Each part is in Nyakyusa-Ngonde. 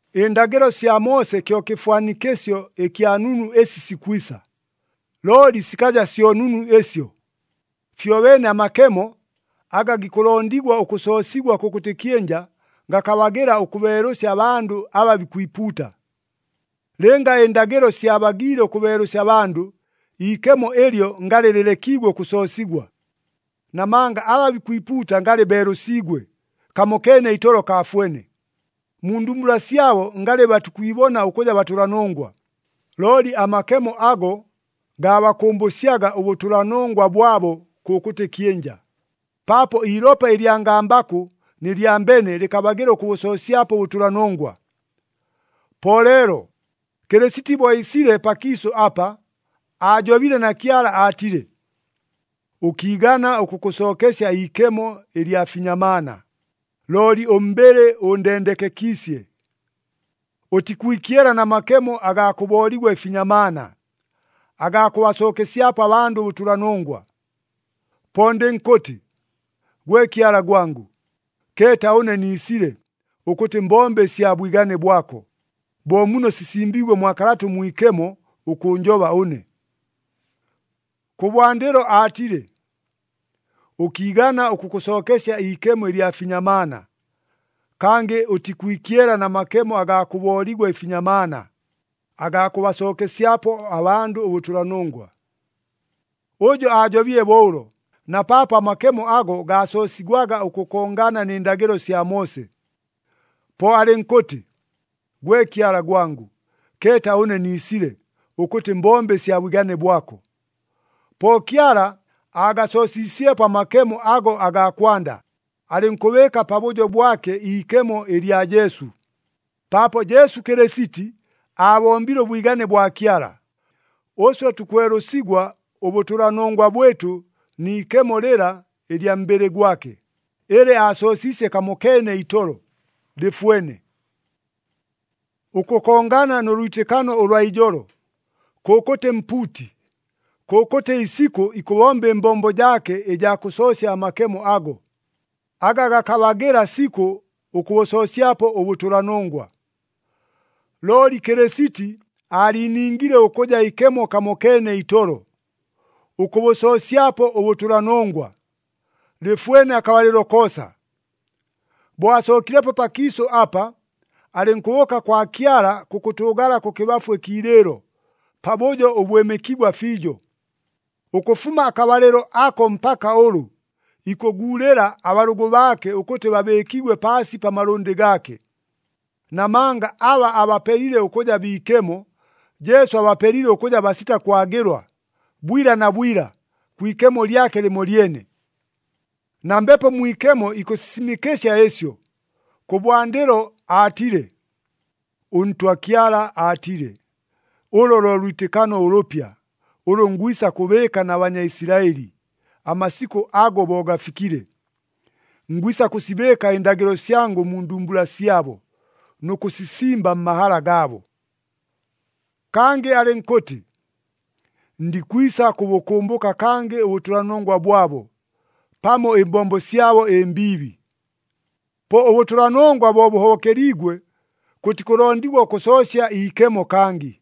Ɨndagɨlo sya Moose kyo kɨfwanikɨsyo ɨkya nunu ɨsi sikwisa, looli sikaja syo nunu ɨsyo. Fyobeene amakemo, aga gikʉlondigwa ʉkʉsoosigwa kʉkʉtɨ kyɨnja, gakabagɨla ʉkʉbeelʉsya abandʉ aba bikwipuuta. Lɨnga ɨndagɨlo syabagiile ʉkʉbeelʉsya abandʉ, iikemo ɨlyo ngalɨ lɨlekiigwe ʉkʉsoosigwa. Namanga aba bikwipuuta ngalɨ beelʉsiigwe, kamokeene itolo kaafwene. Mu ndumbula syabo ngalɨ batikwibona ʉkʉja batʉlanongwa. Looli amakemo ago gaabakʉmbʉsyaga ʉbʉtʉlanongwa bwabo kʉkʉtɨ kyɨnja, paapo iilopa ɨlya ngambakʉ nɨ lya mbene lɨkabagɨla ʉkʉbʉsoosyapo ʉbʉtʉlanongwa. Po leelo, Kɨlɨsiti bo iisile pakiisʉ apa, aajobile na Kyala aatile, “Ʉkiigana ʉkʉkʉsookesya iikemo ɨlya finyamaana, looli ʉmbɨlɨ ʉndendekekiisye. Ʉtikwikyela na makemo agaa kʉbooligwa ɨfinyamaana, agaa kʉbasookesyapo abandʉ ʉbʉtʉlanongwa. Po ndɨnkʉtɨ, ‘Gwe Kyala gwangʉ, keeta ʉne niisile, ʉkʉtɨ mbombe ɨsya bwigane bwako, bo muno sisimbiigwe mwa Kalata ʉMwikemo ʉkʉʉnjoba ʉne.’” Kʉbwandɨlo aatile, “Ʉkiigana ʉkʉkʉsookesya iikemo ɨlya finyamaana, kangɨ ʉtikwikyela na makemo agaa kʉbooligwa ɨfinyamaana, agaa kʉbasookesyapo abandʉ ʉbʉtʉlanongwa.” Ʉjo aajobile bo ʉlo, na paapo amakemo ago gaasoosigwaga ʉkʉkongana nɨ ndagɨlo sya Moose. Po alɨnkʉtɨ, “Gwe Kyala gwangʉ, keeta ʉne niisile, ʉkʉtɨ mbombe ɨsya bwigane bwako.” Po Kyala aagasoosiisyepo amakemo ago agaa kwanda, alɨnkʉbɨɨka pabʉjo bwake iikemo ɨlya Jesu. Paapo Jesu Kɨlɨsiti aabombile ʉbwigane bwa Kyala, ʉswe tukwelʉsigwa ʉbʉtʉlanongwa bwɨtʉ ni ikemo lɨla ɨlya mbɨlɨ gwake, ɨlɨ aasoosiisye kamokeene itolo, lɨfwene. Ʉkʉkongana nʉ lwitɨkano ʉlwa ijolo, kʉkʉtɨ mpuuti, kʉkʉtɨ isikʉ ikʉbomba ɨmbombo jaake ɨjaa kʉsoosya amakemo ago, aga gakabagɨla sikʉ ʉkʉbʉsoosyapo ʉbʉtʉlanongwa. Looli Kɨlɨsiti aaliiningile ʉkʉja ikemo kamokeene itolo, ʉkʉbʉsoosyapo ʉbʉtʉlanongwa, lɨfwene akabalɨlo koosa. Bo asookilepo pakiisʉ apa, alɨnkʉbʉʉka kwa Kyala kʉkʉtʉʉgala kʉkɨbafu ɨkiilɨɨlo, pabʉjo ʉbwɨmɨkigwa fiijo. Ʉkʉfuma akabalɨlo ako mpaka ʉlʉ, ikʉguulɨla abalʉgʉ baake ʉkʉtɨ babɨɨkigwe paasi pa malʉndɨ gaake. Namanga aba abapelile ʉkʉja biikemo, Jesu abapelile ʉkʉja basita kwagɨlwa, bwila na bwila, kwi ikemo lyake lɨmolyene. Na Mbepo Mwikemo ikʉsisimɨkɨsya ɨsyo. Kʉbwandɨlo aatile, “ɄNtwa Kyala aatile, ‘Ʉlʉ lo lwitɨkano ʉlʉpya, ʉlʉ ngwisa kʉbɨɨka na Banyaisilaɨli, amasikʉ ago bo gafikile. Ngwisa kʉsibɨɨka ɨndagɨlo syangʉ mu ndumbula syabo, nʉ kʉsisimba mmahala gaabo.’” Kangɨ alɨnkʉtɨ, “Ndikwisa kʉbʉkʉmbʉka kangɨ ʉbʉtʉlanongwa bwabo, pamo ɨmbombo syabo ɨmbiibi.” Po ʉbʉtʉlanongwa bo bʉhobokeliigwe, kʉtikʉlondigwa ʉkʉsoosya iikemo kangɨ.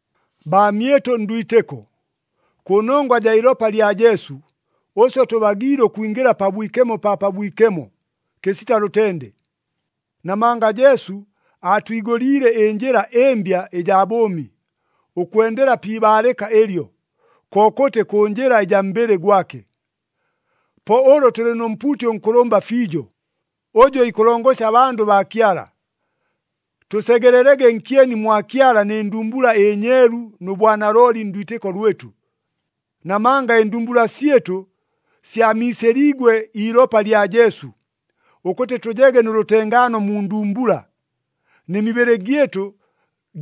Baamyɨtʉ ndwitɨko, kʉnongwa jaa ilopa lya Jesu, ʉswe tʉbagiile ʉkwingɨla Pabwikemo pa Pabwikemo, kɨsita lʉtende. Namanga Jesu aatwigʉliile ɨnjɨla ɨmbya ɨjaa bʉʉmi, ʉkwendela pi ibaalɨka ɨlyo, kokʉtɨ kʉ njɨla ɨjaa mbɨlɨ gwake. Po ʉlʉ tʉlɨ nʉ mpuuti ʉnkʉlʉmba fiijo, ʉjʉ ikʉlongosya abandʉ baa Kyala, tʉsegelelege nkyeni mwa Kyala nɨ ndumbula ɨnyeelu nʉ bwanalooli ndwitɨko lwɨtʉ. Namanga ɨndumbula syɨtʉ syamiisɨliigwe iilopa lya Jesu, ʉkʉtɨ tʉjege nʉ lʉtengaano mu ndumbula, nɨ mibɨlɨ gyɨtʉ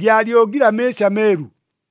gyalyogile amɨɨsi ameelu.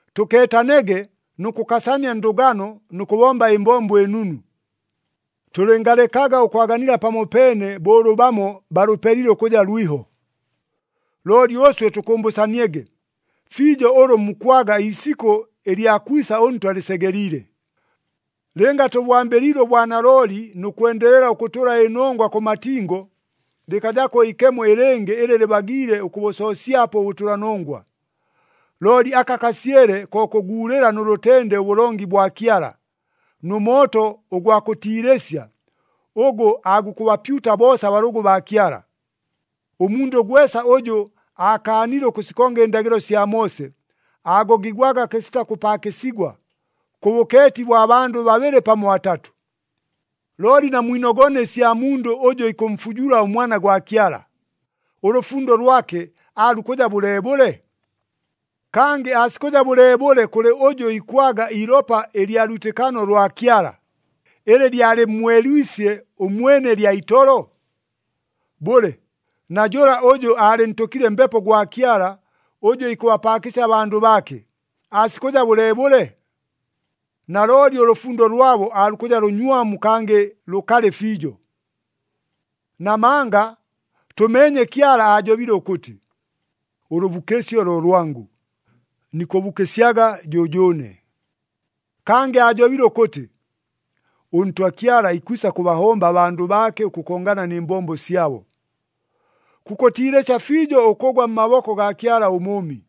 Tʉkeetanege nʉ kʉkasania ndʉgano nʉ kʉbomba ɨmbombo ɨnunu. Tʉlɨngalekaga ʉkwaganila pamopeene bo ʉlʉ bamo balʉpelile ʉkʉja lwiho. Looli ʉswe tʉkʉmbʉsaniege, fiijo ʉlʉ mukwaga iisikʉ ɨlya kwisa ʉNtwa lɨsegeliile. Lɨnga tʉbwambɨliile ʉbwanalooli nʉ kwendelela ʉkʉtʉla ɨnongwa kʉ matingo, lɨkajako iikemo ɨlɨngɨ ɨlɨ lɨbagiile ʉkʉbʉsoosyapo ʉbʉtʉlanongwa. Looli aka kasyele ko kʉguulɨla nʉ lʉtende ʉbʉlongi bwa Kyala, nʉ mooto ʉgwa kʉtiilɨsya ʉgʉ aagukʉbapyuta boosa abalʉgʉ baa Kyala. Ʉmundʉ gwesa ʉjʉ aakaanile ʉkʉsikonga ɨndagɨlo sya Moose, aagogigwaga kɨsita kʉpaakɨsigwa, kʉ bʉkeeti bwa bandʉ babɨlɨ pamo batatʉ. Looli namwinogone ɨsya mundʉ ʉjʉ ikʉmfujula ʉMwana gwa Kyala. Ʉlʉfundo lwake aalukʉja bʉleebʉle? Kangɨ aasikʉja bʉleebʉle kʉlɨ ʉjʉ ikwaga iilopa ɨlya lwitɨkano lwa Kyala, ɨlɨ lyalɨmmwelwisye ʉmwene lya itolo? Bʉle, na jʉla ʉjʉ aalɨntʉkile Mbepo gwa Kyala ʉjʉ ikʉbapaakɨsya abandʉ baake, aasikʉja bʉleebʉle? Nalooli ʉlʉfundo lwabo aalukʉja lʉnywamu kangɨ lʉkalɨ fiijo. Namanga tʉmeenye Kyala aajobile ʉkʉtɨ, “Ʉlʉbukɨsyo lo lwangʉ, nikʉbukɨsyaga jʉjʉʉne.” Kangɨ aajobile ʉkʉtɨ, “ɄNtwa Kyala ikwisa kʉbahomba abandʉ baake ʉkʉkongana nɨ mbombo syabo.” Kukʉtiilɨsya fiijo ʉkʉgwa mmaboko gaa Kyala ʉMʉʉmi.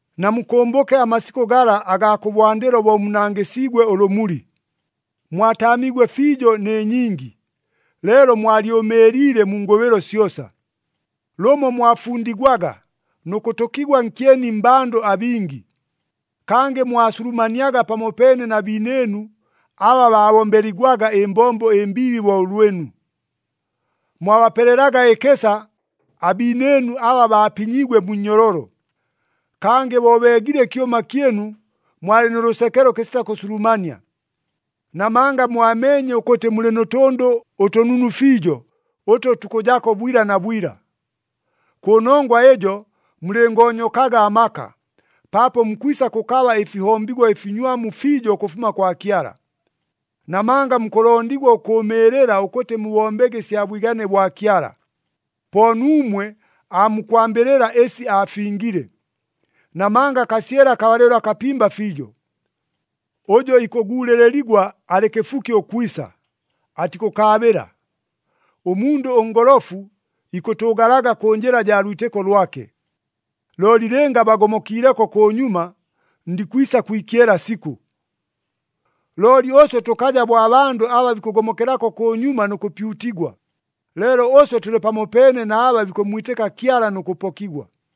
Namukʉmbʉke amasikʉ gala agaa kʉbwandɨlo bo munangɨsiigwe ʉlʉmuli, mwataamiigwe fiijo nɨ nyingi, leelo mwalyʉmɨɨliile mu ngʉbɨlo syosa. Lʉmo mwafundigwaga nʉ kʉtʉkigwa nkyeni mmbandʉ abingi. Kangɨ mwasulumaniaga pamopeene na biinɨɨnu aba baabombeligwaga ɨmbombo ɨmbiibi bo ʉlwɨnu. Mwabapelelaga ɨkɨsa abiinɨɨnu aba baapinyiigwe mu nnyololo. Kangɨ bo beegile ɨkyʉma kyɨnu mwalɨ nʉ lʉsekelo kɨsita kʉsulumania. Namanga mwameenye ʉkʉtɨ mulɨ nʉ tʉndʉ ʉtʉnunu fiijo ʉtʉ tukʉjako bwila na bwila. Kʉnongwa ɨjo mulɨngoonyokaga amaka, paapo mukwisa kʉkaba ɨfihombigwa ɨfinywamu fiijo ʉkʉfuma kwa Kyala. Namanga mukʉlondigwa ʉkʉʉmɨɨlɨla ʉkʉtɨ mubombege ɨsya bwigane bwa Kyala, po nuumwe aamukwambɨlɨla ɨsi aafingile. Namanga kasyele akabalɨlo akapimba fiijo, “Ʉjʉ ikʉguulɨligwa alɨ kɨfuki ʉkwisa, atikʉkaabɨla. Ʉmundʉ ʉngolofu ikʉtʉʉgalaga kʉ njɨla jaa lwitɨko lwake. Looli lɨnga bagomokiileko kʉnyuma, ndikwisa kwikyela sikʉ.” Looli ʉswe tʉkaja bo abandʉ aba bikʉgomokelako kʉnyuma nʉ kʉpyutigwa, leelo ʉswe tʉlɨ pamopeene na aba bikʉmmwitɨka Kyala nʉ kʉpokigwa.